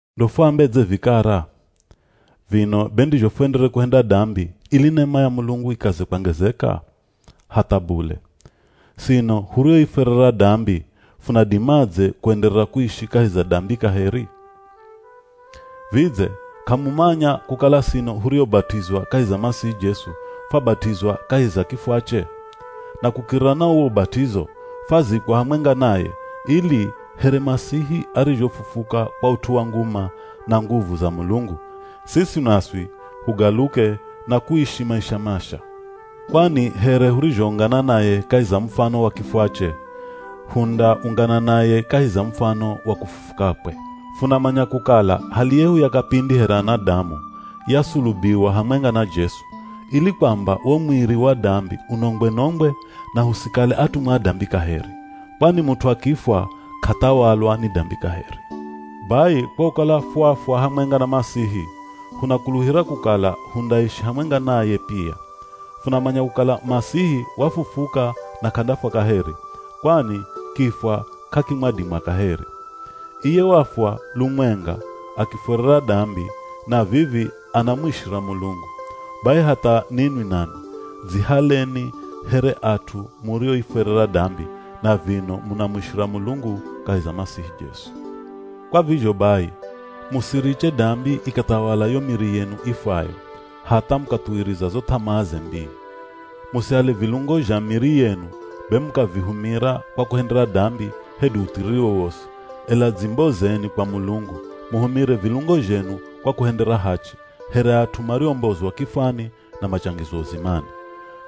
Ndo fuambedze vikara? Vino be ndizho fuenderere kuhenda dambi ili nema ya Mulungu ikaze kwangezeka? Hatha bule! Sino hurioifwerera dambi, funadimadze kuenderera kuishi kahi za dambi kaheri? Vidze k'amumanya kukala sino huriobat'izwa kahi za Masihi Jesu, fwabat'izwa kahi za kifwache? Na kukiririra na uwo ubat'izo, fwazikwa hamwenga naye, ili here Masihi arizhofufuka kwa ut'u wa nguma na nguvu za Mulungu, siswi naswi hugaluke na kuishi maisha masha. Kwani here hurizhoungana naye kahi za mufano wa kifwache, hundaungana naye kahi za mufano wa kufufukakwe. Funamanya kukala hali yehu ya kapindi here anadamu, yasulubiwa hamwenga na Jesu, ili kwamba wo mwiri wa dambi unongwe-nongwe, na husikale atumwa a dambi kaheri. Kwani mut'u akifwa k'athawalwa ni dambi kaheri. Bai kwa kukala fwafwa hamwenga na Masihi, hunakuluhira kukala hundaishi hamwenga naye pia. Funamanya kukala Masihi wafufuka na k'andafwa kaheri, kwani kifwa k'akimwadima kaheri. Iye wafwa lumwenga akiifwerera dambi, na vivi anamuishira Mulungu. Bai hatha ninwi nanwi dzihaleni here at'u murioifwerera dambi na vino munamuishira Mulungu kahi za Masihi Jesu. Kwa vizho bai, musiriche dambi ikathawala yo miri yenu ifwayo hatha mukathuwiriza zo th'amaaze mbii. Musihale vilungo zha miri yenu be mukavihumira kwa kuhendera dambi hedu uthiriri wowosi, ela dzimbozeni kwa Mulungu, muhumire vilungo zhenu kwa kuhendera hachi, here at'u mariombozwa kifwani na machangizwa uzimani.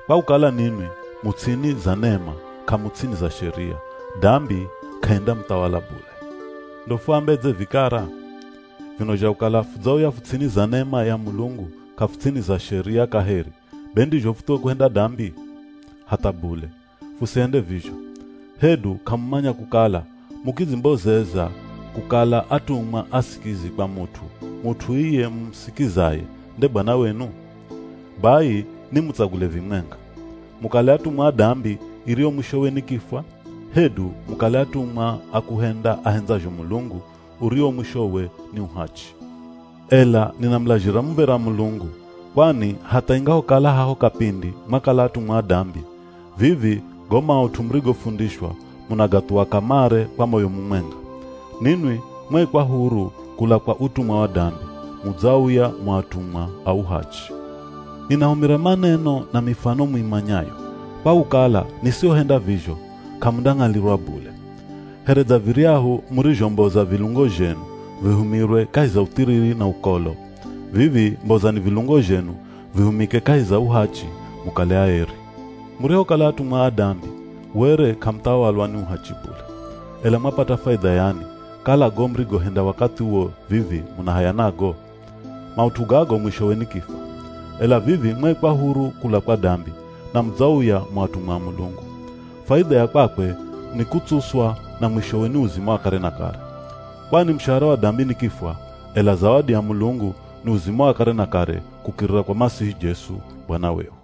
Kwa kukala ninwi mu ts'ini za nema k'amu ts'ini za Sheria, dambi k'aindamuthawala bule. Ndo fuambedze vikara? Vino zha kukala fudzauya fu ts'ini za nema ya Mulungu k'afu ts'ini za Sheria kaheri, be ndizho futhuwe kuhenda dambi? Hatha bule! Fusihende vizho. Hedu k'amumanya kukala mukidzimbozeza kukala atumwa asikizi kwa mut'u, mut'u iye mumusikizaye nde bwana wenu? Bai nimutsagule vimwenga. Mukale atumwa a dambi iriyo mwishowe ni kifwa, hedu mukale atumwa a kuhenda ahendzazho Mulungu uriwo mwishowe, ni uhachi. Ela ninamulazhira muv̱era Mulungu, kwani hatha ingahokala haho kapindi mwakala atumwa a dambi, vivi go maut'u murigofundishwa, munagathuwa kamare kwa moyo mumwenga. Ninwi mwaikwa huru kula kwa utumwa wa dambi, mudzauya mu atumwa a uhachi. Ninahumira maneno na mifano muimanyayo, kwa kukala nisihohenda vizho, k'amundang'alirwa bule. Here dza viryahu murizhomboza vilungo zhenu, vihumirwe kahi za uthiriri na ukolo, vivi mbozani vilungo zhenu vihumike kahi za uhachi, mukale aeri. Murihokala atumwa a dambi, were k'amuthawalwa ni uhachi bule. Ela mwapata faidha yani, kala go murigohenda wakathi uwo vivi muna haya nago? Maut'u gago mwishowe ni kifwa. Ela vivi mwaikwa huru kula kwa dambi, na mudzauya mu atumwa a Mulungu. Faidha ya kwakwe ni kutsuswa na mwishowe ni uzima wa kare na kare. Kwani mushahara wa dambi ni kifwa, ela zawadi ya Mulungu ni uzima wa kare na kare kukirira kwa Masihi Jesu, Bwana wehu.